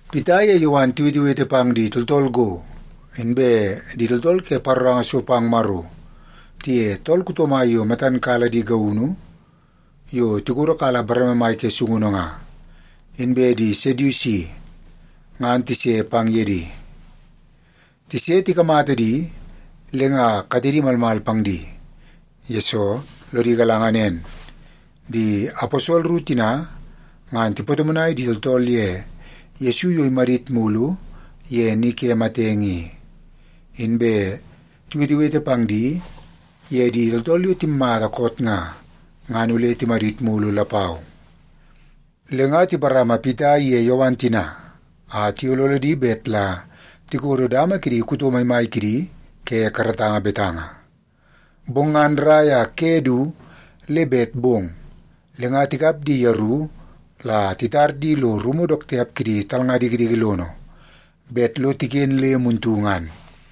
Pita ye Yowan tiwetewete pang di tooltool go, inbe di tooltool ke paroranga so pang Maro, tiye tool kuto mai yo matan kala di gaunu yo tikodo kala bareme mai ke sungunu nga, inbe di Sedusi, ngan tise pang ye di. Tise tikamata di, le nga katedi malmal pang di, yesoo lodi galanga nen, di aposol ru tina ngan tipatomonai di tooltool ye Yesu yo imadit mulu ye ni ke matenge i, inbe tiwetewete pang di ye di tooltool yo timatamata koot nga, ngan ole timadit mulu lapau. Le nga tiparama Pita iye Yowan tina a tiyololo di bet la tikodo dama ke di kuto maimai kidi ke karatanga betanga. Bong ngan rrai a ke du le bet bong, le nga tikap di yeru la titar di lo rumu dook tiap kidi talnga dikidiki lono bet lo tiken le muntu ngan.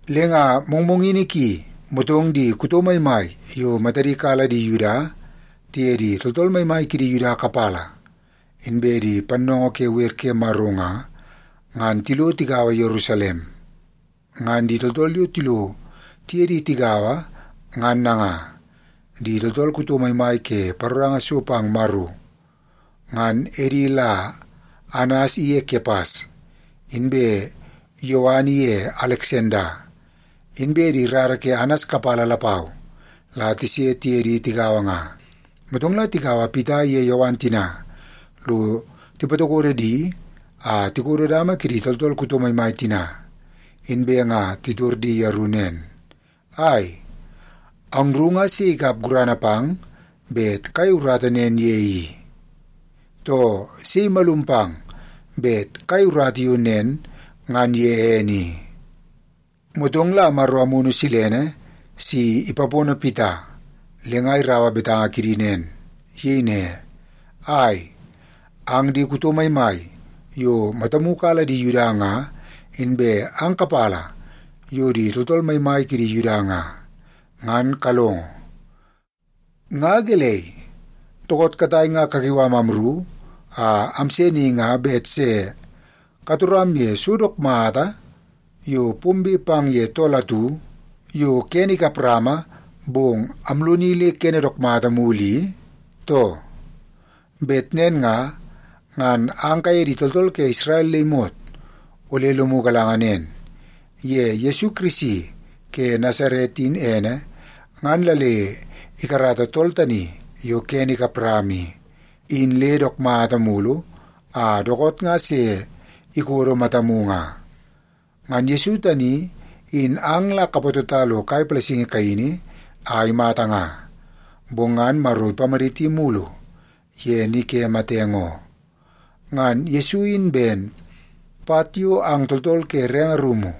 Le nga mongmongini ki, motong di kuto maimai yo matadi kala di Yuda tiye di tooltool maimai kidi Yuda kapala inbe di pannoongoo ke wer ke Maro nga, ngan tilo tigaua Yerusalem. Ngan di tooltool yo tilo tiye di tigaua ngan nanga: di tooltool kuto maimai ke paroranga so pang Maro, ngan edi la Anas iye Kepas, inbe Yowan iye Aleksanda, inbe di rara ke Anas kapala lapau la tise tiye di tigaua nga. Motong la tikaua Pita iye Yowan tina lo tipatokodo di a tikodo dama kidi tooltool kuto maimai tina, inbe nga titor di yeru nen, “Ai, angru nga sei ikap gurana pang bet kayei urata nen ye i? Too, sei imalum pang bet kayei urata yo nen ngan ye ene i?” Motong la Maro Amunu Silene si ipapono Pita, le nga iraua betanga kidi nen. Iyei ne, “Ai, ang di kuto maimai yo matamu kala di Yuda nga inbe ang kapala yo di tooltool maimai kidi Yuda nga, ngan kalongo! Nga gelei, dookoot katai nga kakiu am amru a amse ni nga bet se katoram ye so dook mata yo pombe pang ye tool atu yo kene kap rama bong amloni le kene dook mata mulu i, too? Bet nen nga, ngan ang kaye di tooltool ke Isrel le imot ole lomu galanga nen. Ye Yesu Kirisi ke Nasaret in ene, ngan la le ikarata tool tani yo kene ikap rama i, in le dook mata mulu a dookoot nga se ikodo matamu nga. Ngan Yesu tani in ang la kapatota lo kai palasingi kaini a imata nga, bong ngan Maro ipamaditi mulu ye ni ke matenge oo. Ngan Yesu in ben, ‘Pat yo ang tooltool ke renge rumu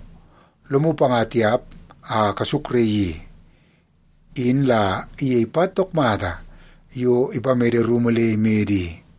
lomu panga tiap a kasukraii i, in la iyei pat dook mata yo ipamede rumu le imede i.’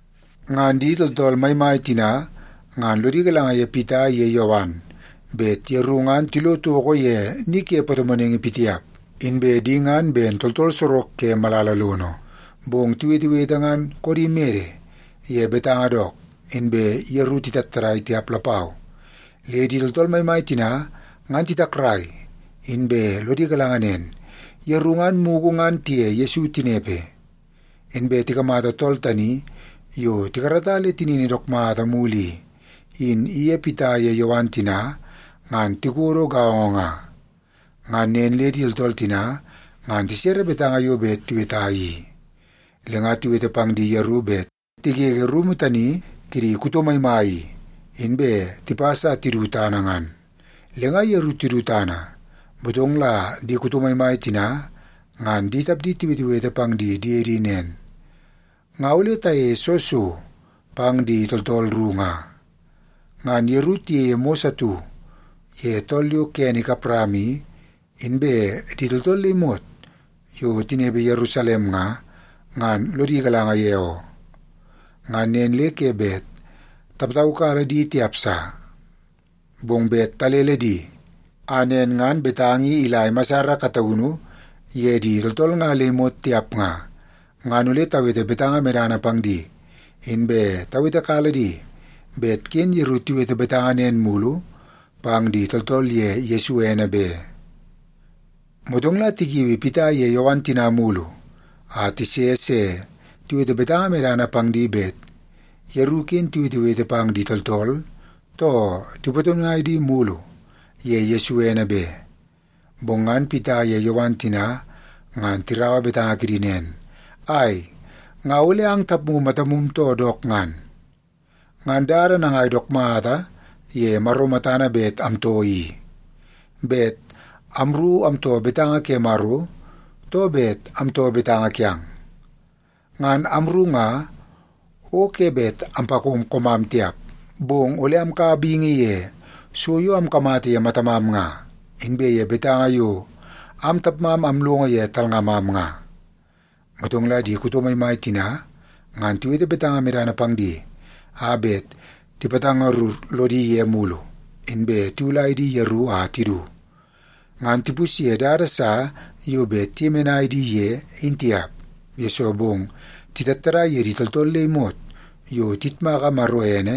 Ngan di tooltool maimai tina ngan lodi galanga ye Pita iye Yowan bet yeru ngan tilo toko ye ni ke patomonaingi pitiap, inbe di ngan ben tooltool sorok ke malala lono. Bong tiwetewete ngan koodi mede ye betanga dook, inbe yeru titattadai tiap lapau. Le di tooltool maimai tina ngan titakrai, inbe lodi galanga nen, yeru ngan mugu ngan tiye Yesu tinepe. Inbe tikamata tool tani yo tikarata le tinini dook mata mulu i, in iye Pita ye Yowan tina ngan tikodo gaongo nga. Ngan nen le di tooltool tina ngan tisere betanga yo bet tiweta i. Le nga tiwete pang di yeru bet tigege rumu tani kidi kuto maimai i, inbe tipas a tidu tana ngan. Le nga yeru tidu tana, motong la di kuto maimai tina ngan di tapdi tiwetewete pang di diedi nen, “Nga ole tayeie soo so pang di tooltool ru nga? Ngan yeru tiyeie mos atu ye tool yo kene ikap rama i, inbe di tooltool le imot yo tinepe Yerusalem nga, ngan lodi galanga ye oo. Ngan nen le ke bet tapataukala di tiap sa. Bong bet talele di a nen ngan betanga i ila imasar kataunu ye di tooltool nga le imot tiap nga, ngan ole tawete betanga medana pang di, inbe tawetekala di bet ken yeru tiwete betanga nen mulu pang di tooltool ye Yesu ene be.” Motong la tikiui Pita iye Yowan tina mulu a tise se tiwete betanga medana pang di bet yeru ken tiwetewete pang di tooltool too tipatomonai di mulu ye Yesu ene be. Bong ngan Pita ye Yowan tina ngan tiraua betanga kidi nen, “Ai, nga ole ang tapmu matamu too dook ngan? Ngan dada nangai dook mata ye Maro matana bet amtoo i? Bet amru amtoo betanga ke Maro, too bet amtoo betanga kiang? Ngan amru nga, o ke bet ampakom koomam tiap. Bong ole amkaua bingi ye so yo amkamata ye matamam nga, inbe ye betanga yo am tapmam amlongo ye talngamam nga.” Motong la di kuto maimai tina ngan tiwete betanga medana pang di a bet tipatangarur lodi ye mulu, inbe tiwulai di yeru a tidu. Ngan tipusye dada sa yo bet tiyemenai di ye, in tiap, yesoo bong titattadai ye di tooltool le imot yo tiyitmaka Maro ene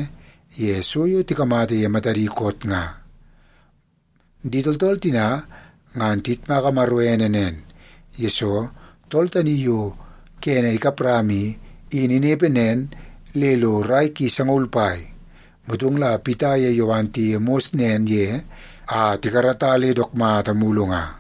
ye so yo tikamata ye matadi koot nga. Di tooltool tina ngan tiyitmaka Maro ene nen, yesoo tool tani yo kene ikap rama i, in inepe nen le lo rai ki sangaul pai, motong la Pita ye Yowan tiyeie mos nen ye a tikarata le dook mata mulu nga.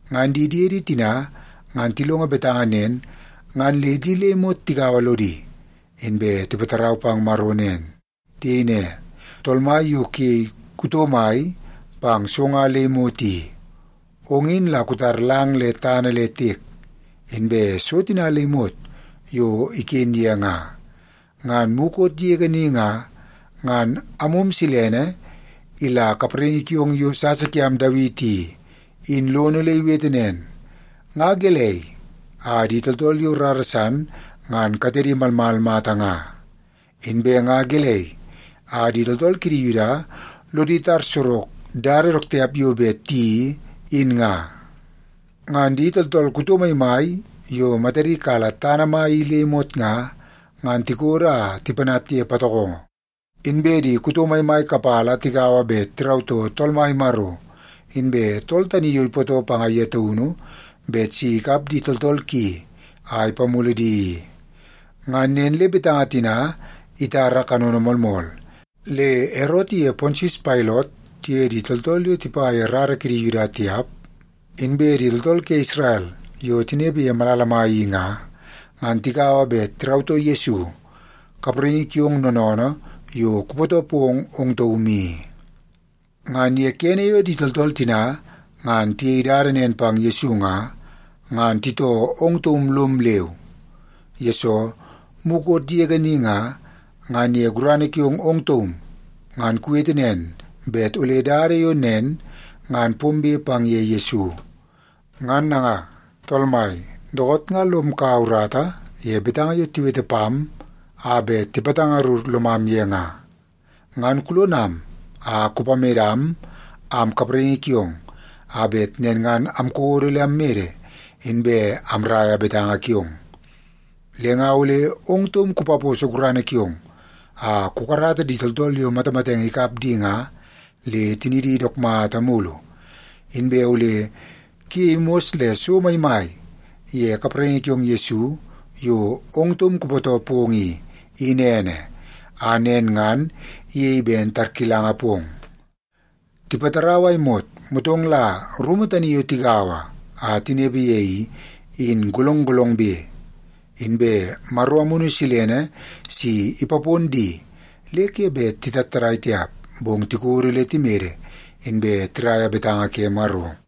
Ngan di diedi tina ngan tilongo betanga nen, ngan le di le imot tigaua lodi, inbe tipatarau pang Maro nen. Tiyei ne, “Tool Mai yo kuyei kuto mai pang so nga le imot i, ong in la kutar lang le tana le tiek, inbe so tina le imot yo iken ye nga. Ngan mukot yege ni nga, ngan Amum Silene ila kapraingi kiong yo sasa kiam Dawiti i, in lono le iwete nen, ‘Nga gelei a di tooltool yo rara san ngan katedi malmal mata nga? Inbe nga gelei a di tooltool kidi Yuda lodi tar sorok dada dook tiap yo bet tiyeii, in nga? Ngan di tooltool kuto maimai yo matadi kala tana mai i le imot nga, ngan tikodo a tipanat ye patokongo. Inbe di kuto maimai kapala tigaua bet tirautoo Tool Mai Maro inbe tool tani yo ipootoo panga ye taunu bet si ikap di tooltool ki a ipamulu di i.’ Ngan nen le betanga tina itara kanono moolmool, le Erot iye Pontius Pailot tiye di tooltool yo tipa ye rara kidi Yuda tiap, inbe di tooltool ke Isrel yo tinepe ye malala mai i nga, ngan tigaua bet tirautoo Yesu, kapraingi kiong noonoonoo yo kupootoo pong ong taum i. Ngan ye kene yo di tooltool tina ngan tiyei dada nen pang Yesu nga, ngan titoo ong taum lom leu. Yesoo, mukot yege ni nga, ngan ye gurana kiong ong taum ngan kuwete nen bet ole dada yo nen ngan pombe pang ye Yesu. Ngan nanga, Tool Mai, dookoot nga lom kaua urata ye betanga yo tiwete pam a bet tipatangarur lomam ye nga, ngan kulonam a kupamedam am kapraingi kiong a bet nen ngan amkodo le ammede, inbe amraia betanga kiong. Le nga ole ong taum kupaposo gurana kiong a kukarata di tooltool yo matamatenge ikap di nga, le tinidi dook mata mulu. Inbe ole kuyei mos le so maimai ye kapraingi kiong Yesu yo ong taum kupootoo pong i, in ene, a nen ngan iyei ben tarkilanga pong.” Tipatarau a imot, motong la rumu tani yo tigaua a tinepe ye i, in golong golongbe. Inbe Maro Amunu Silene si ipapon di le ke bet titattadai tiap, bong tikodo le timede, inbe tiraia betanga ke Maro.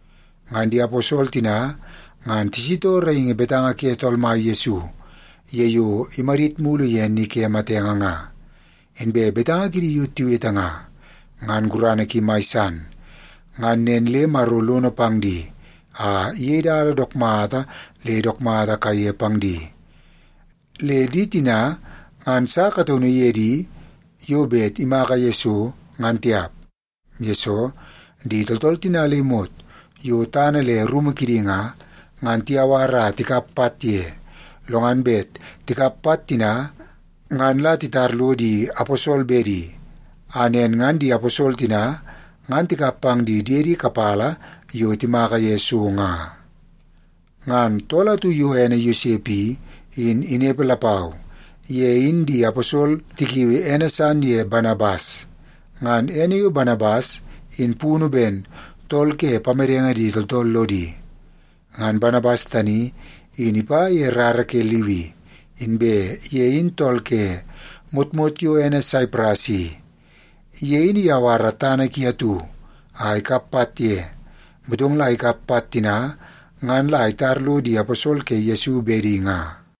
Ngan di aposol tina ngan tisitoo raingi betanga ke Tool Mai Yesu ye yo imadit mulu ye ni ke matenge nga. Inbe betanga kidi yo tiwete nga, ngan gurana ki mai san. Ngan nen le Maro lono pang di a iyei dada dook mata le dook mata kaiye pang di. Le di tina ngan sa kataunu ye di yo bet imaka ye so, ngan tiap. Yesoo, di tooltool tina le imot yo tana le rumu kidi nga, ngan tiyawar a tikap pat ye, lo ngan bet tikap pat tina ngan la titar lo di aposol bedi, a nen ngan di aposol tina ngan tikap pang di diede kapala yo timaka ye so nga. Ngan tool atu yo ene Yosep i, in inepe lapau. Ye in di aposol tikiui ene san ye Banabas. (Ngan ene yo Banabas in punu ben Tool ke Pamedenge Di Tooltool Lodi.) Ngan Banabas tani, in ipa ye rara ke Liwi, inbe ye in tool ke motmot yo ene Saipras i. Ye in iyawara tana ki atu a ikap pat ye, motong la ikap pat tina ngan la itar lo di aposol ke Yesu bedi nga.